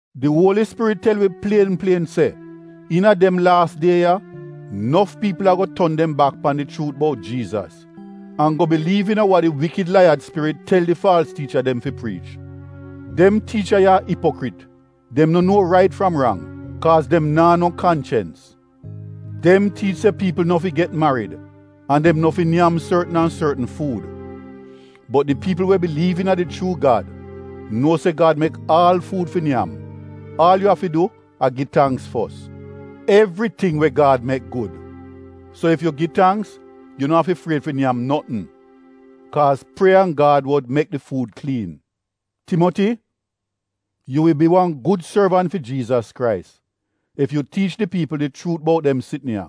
Di Uoli Spirit tel wi plien plien se iina dem laas die ya nof piipl ago ton dem bak pan di chuut bout Jiizas an go biliiv iina wa di iivl laiyad spirit tel di faalz tiicha dem fi priich. Dem tiicha ya a Ipokrit, dem no nuo rait fram rang kaaz dem naa no kanchens. Dem tiich se piipl no fi get marid an dem no fi nyam sortn an sortn fuud. Bot di piipl we biliiv iina di chuu Gad nuo se Gad mek aal fuud fi nyam, aal yu afi du a gi tangks fos. Evriting we Gad mek gud, so ef yu gi tangks yu no afi fried fi nyam notn. Kaaz prieya an Gad wod mek di fuud kliin. Timoti, yu wi bi wan gud sorvant a Jiizas Krais ef yu tiich di piipl di chuut bout dem sitn ya,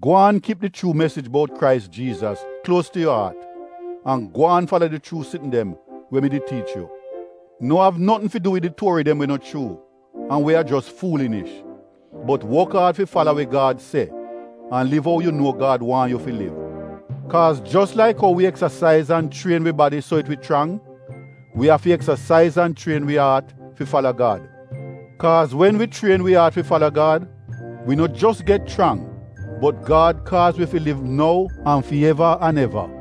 gwaan kip di chuu mesij bout Krais Jiizas kluos tu yu aat an gwaan fala di chuu sitn dem we mi did tiich yu. No av notn fi du wid di tuori dem we no chuu an we a jos fuulinish, bot wok aad fi fala we Gad se an liv ou yu nuo Gad waahn yu fi liv. Kaaz jos laik ou wi eksasaiz an chrien wi badi so it wi chrang, wi afi eksasaiz an chrien wi aat fi fala Gad. Kaaz wen wi chrien wi aat fi fala Gad wi no jos get chrang bot Gad kaaz wi fi liv nou an fi eva muor.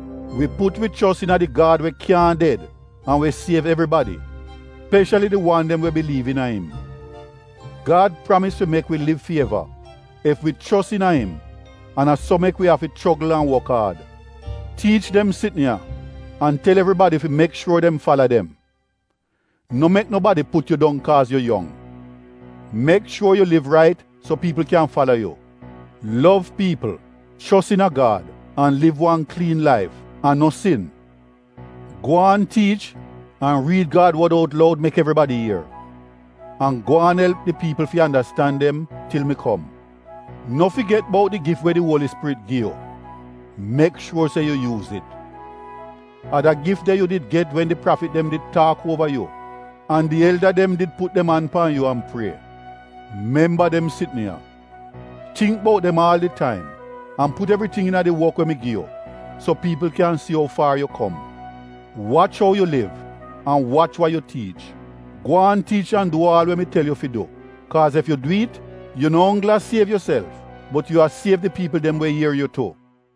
Wi put wi chos iina di Gad we kyaahn ded an we siev evribadi, speshali di wan dem we biliiv iina im. Gad pramis fi mek wi liv fi eva ef wi chos iina im an a so mek wi afi chogl an wok aad. Tiich dem sitn ya an tel evribadi fi mek shuor dem fala dem. No mek nobadi put yu dong kaaz yu yong. Mek shuor yu liv rait so piipl kyan fala yu: lov piipl, chos iina Gad an liv wan kliin laif an no sin. Gwaan tiich an riid Gad wod out loud mek evribadi ier, an gwaan elp di piipl fi andastan dem til mi kom. No figet bout di gif we di Uoli Spirit gi yu, mek shuor se yu yuuz it. A da gif de yu did get wen di prafit dem did taak uova yu an di elda dem did put dem an pan yu an prie. Memba dem sitn ya. Tingk bout dem aal di taim an put evriting iina di wok we mi gi yu, so piipl kyan si ou far yu kom. Wach ou yu liv an wach wa yu tiich. Gwaan tiich an du aal we mi tel yu fi du, kaaz ef yu du it, yu no onggl a siev yuself bot yu a siev di piipl dem we ier yu tu.